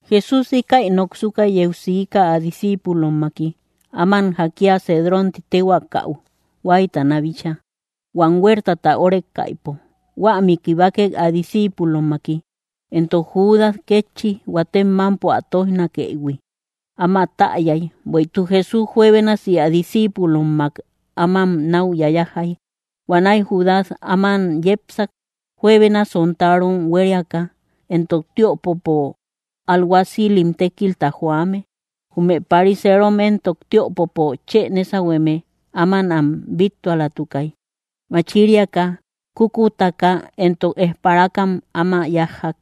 Jesús íkäi noksuka yeu siika, ä discíipulommaki, áman jakia Cedrón ti téhuaakau huáytana bíchaa, huam huertata órekaïpo; huämi kibakek ä discíipulommaki. Éntok Judas kétchi, huatem mampo ä toijnakëïhui, áma täyay, bueïtuk Jesús juebénasi ä discíipulommak ámam náu yayajay. Huanäi Judas áman yepsak, juebena sontarom huériaka, éntok tiöpopo alguacil tékilta joame. Jume pariseerom éntok tiöpopo chë nésahueme áman am bíttualatukay. Machiriaka, kúkutaka, éntok esparakam áman yájjak.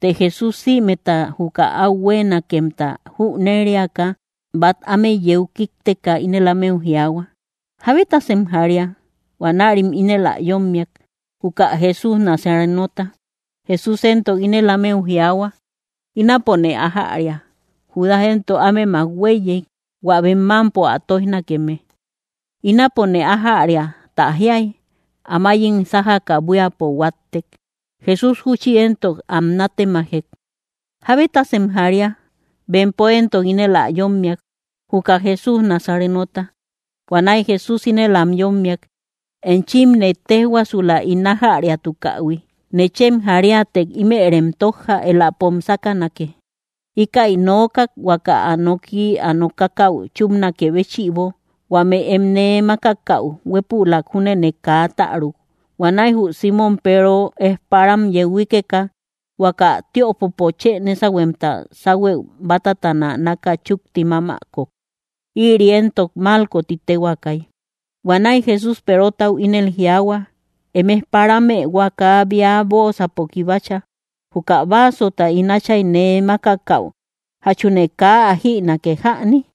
Të Jesús, sïmeta juka áu huéenakemta jüneriaka, bát ámeu yeu kíkteka, ínel ámeu jiaahua: —¿Jábetasem jaria? Huanärim ínel ä yómmiak: —Juka Jesús Nazarenota. Jesús éntok ínel ámeu jiaahua: —Ínapone ájäria. Judas éntok ámemak huéiyey, hua bem mámpo ä tóijnakeme. “Ínapone ájäria” tä jiay, amayim sájaka buíapo huáttek. Jesús júchi éntok am natemajek: —¿Jábetasem jaria? Bempo éntok ínel ä yómmiak: —Juka Jesús Nazarenota. Huanäi Jesús ínel am yómmiak: —Enchimne téjhuaasula ín ájäriatukähui. Nechem jariätek, ímërem tójja; éläpom sákanake. Íkäi nookak, huaka ä noki ä nokakäu chúpnakë béchïbo: “Huame em nee mákakäu, huépülak júnene kaa täruk.” Huanäi jü Símon Peero, ejparam yeu huíkeka, huaka tiöpopo chë nésahuemta sáhuëu bátatana náka chúkti mámäkok. Ïri éntok Malco ti téhuaakay. Huanäi Jesús Perotau ínel jiaahua: —Em ejparamë huaka bea bóosapo kibacha. Juka vaasota ín Áchay nee mákakäu, ¿jachune kaa ä jïnake jäni?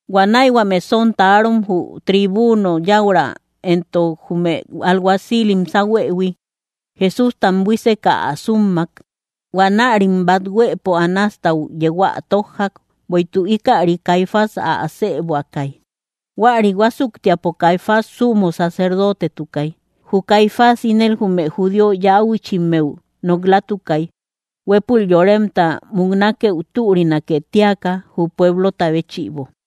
Huanäi huame sontarom, jü tribuno yäura, éntok jume alguacilim sáhuëhui, Jesústam buíseka ä súmmak. Huanärim bát huëpo Anástau yeu ä tójjak; bueïtuk ikäri Caifás ä asëbuakay. Huäri huásuktiapo Caifás sumo sacerdotetukay. Jü Caifás ínel jume judío yäuchimmeu nok‑latukay, huépul yoremta muknakeu türinake tíaka, jü pueblota béchïbo.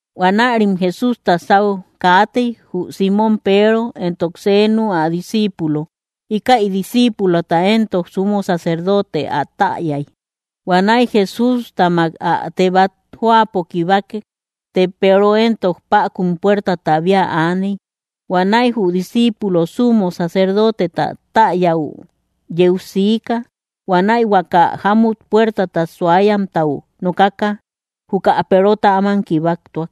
Huanärim Jesústa sáu kaatey, jü Símon Peero éntok senu ä disciipulo. Íkäi disciipulota éntok sumo sacerdote ä täyay. Huanäi Jesústamak ä teebat jóapo kibakek; të Peero éntok päkun puertata bía aaney. Huanäi jü disciipulo sumo sacerdoteta täyäu yeu siika. Huanäi huaka jámut puertata suayamtau nokaka, juka Perota áman kibaktuak.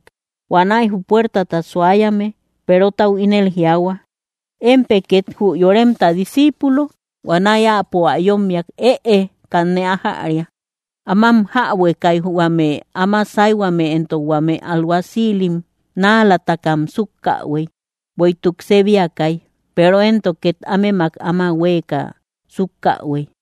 Huanäi jü puertata suayame Perotau ínel jiaahua: —¿Émpë két jü yoremta disciipulo? Huanäi áapo ä yómmiak: —Ëe, kanne ájäria. Ámam jäbuekay, huame áma sáyhuame éntok huame alguacilim. Náalatakam súkkähuey, bueïtuk sébiakay. Peero éntok két ámemak áma huéeka súkkähuey.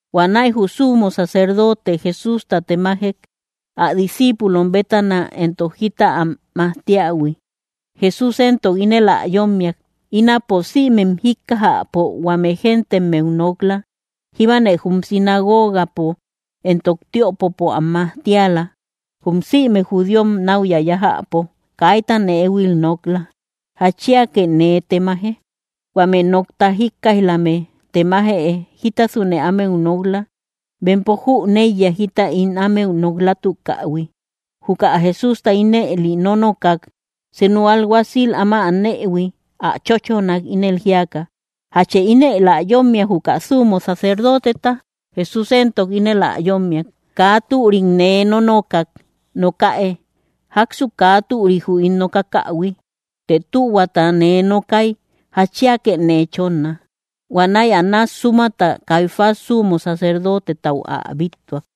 Huanäi jü sumo sacerdote Jesústa temajek, ä discíipulom bétana éntok jita am majtiähui. Jesús éntok ínel ä yómmiak: —Ínapo sïmem jíkkajäpo huame géntemmeu nok‑la. Jíbane jum sinagogapo éntok tiöpopo am majtiala, jum sïme judíom náu yayájäpo. Kaitane éhuil nok‑la. ¿Jatchiake nee temaje? Huame nokta jíkkaij‑lamë temaje jítasune ámeu nok‑la. Bempo jüneiya jita ín ámeu nok‑latukähui. Juka Jesústa ínëli nónokak, senu alguacil áma anëhui ä chóchonak, ínel jíaka: —¿Jachë ínel ä yómmia, juka sumo sacerdoteta? Jesús éntok ínel ä yómmiak: —Kaa türik nee nónokak, nokäe, ¿jáksu kaa türi jü ín nokakähui? Të tühuata nee nokay, ¿jatchiake nee chónna? Huanäi Anás súmata, Caifás sumo sacerdotetau ä bíttuak.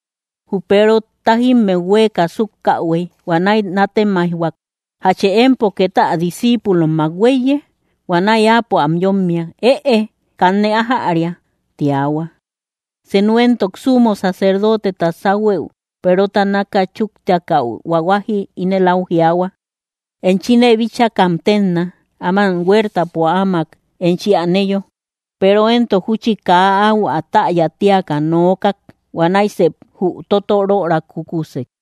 Jü Peero tájimmeu huéeka súkkähuey, huanäi nátemaijhuak: —¿Jachë empo két ä discíipulommak huéiye? Huanäi áapo am yómmiak: —Ëe, kanne ájäria —tiahua. Senu éntok sumo sacerdoteta sáhuëu Perota náka chúktiakäu huahuaji ínel áu jiaahua: —¡Enchine bíchakam ténna, áman huertapo áamak enchi aneyo! Peero éntok júchi kaa áu ä täya tíaka nookak. Huanäi sep jü totoröra kúkusek.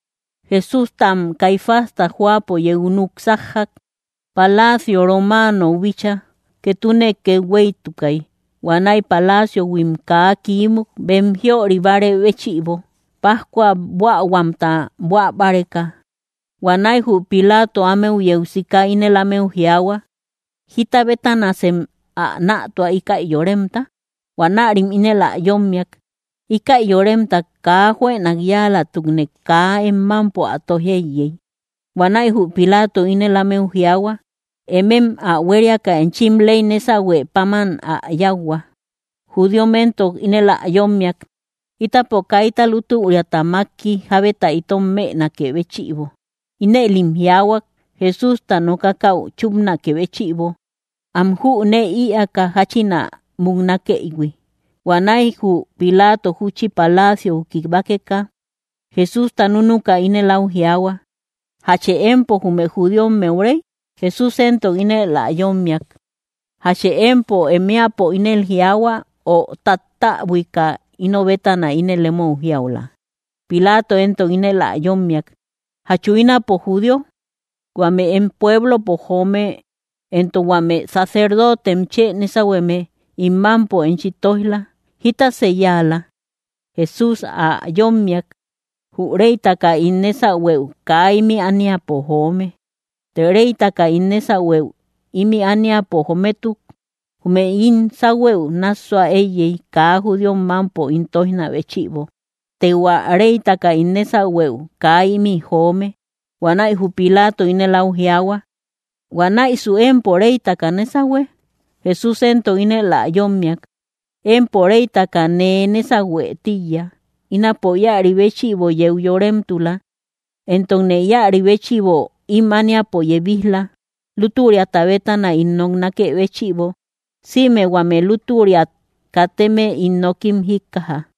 Jesústam Caifásta jóapo yeu núk sájjak, palacio romaanou bíchaa. Ketune kethueytukay. Huanäi palaciohuim kaa kiímuk, bem jiöri bárë béchïbo, pájcua buähuamta buä báreka. Huanäi jü Pilaato ámeu yeu sika ínel ámeu jiaahua: —¿Jíta bétanasem ä nätua, íkä yoremta? Huanärim ínel ä yómmiak: —Íkä yoremta kaa juënak yáalatukte kaa em mámpo ä tóij éiyey. Huanäi jü Pilaato ínel ámeu jiaahua: —Emem ä huériaka, enchim ley nésahue páman ä yáuhua. Judíom éntok ínel ä yómmiak: —Ítapo kaita lútüriata mákki, jábeta itom mënakë béchïbo. Inëlim jiaahuak, Jesústa nokakäu chúpnakë béchïbo, am jünee ïaaka jáchin ä muknakëïhui. Huanäi jü Pilaato júchi palaciou kibakeka, Jesústa núnuka ínel áu jiaahua: —¿Jachë empo jume judíommeu Rey? Jesús éntok ínel ä yómmiak: —¿Jachë empo em éäpo ínel jiaahua, o tattäbuika ino bétana ínel emou jiaula? Pilaato éntok ínel ä yómmiak: —¿Jachu ínapo judío? Huame em pueblopo joome éntok huame sacerdotem chë nésahueme ín mámpo enchi tóij‑la. ¿Jítasë yáala? Jesús ä yómmiak: —Jü reytaka ín nésahueu kaa ímï ániapo joome. Të reytaka ín nésahueu ímï ániapo jométuk, jume ín sáhuëu nássua éiyey, kaa judíom mámpo ín tóijna béchïbo. Të hua reytaka ín nésahueu kaa ímï joome. Huanäi jü Pilaato ínel áu jiaahua: —¿Huanäisu empo reytaka nésahue? Jesús éntok ínel ä yómmiak: —Empo reytaka nee nésahue tíiya. Ínapo íäri béchïbo yeu yoremtula, éntokne íäri béchïbo ím ániapo yebij‑la, lútüriata bétana ín noknakë béchïbo. Sïme huame lútüriat kateme ín nokim jíkkaja.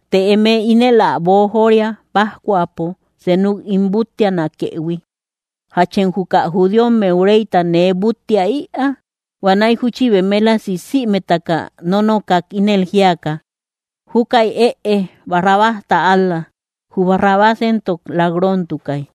Të eme ínel ä boojoria, pájcuapo senuk ín búttianakëhui. ¿Jachem juka judíommeu Reyta nee búttia ïaa? Huanäi júchi bemélasi sïmetaka nónokak, ínel jíaka: —Júkäi ëe, Barrabásta ál‑la. Jü Barrabás éntok lak‑rontukay.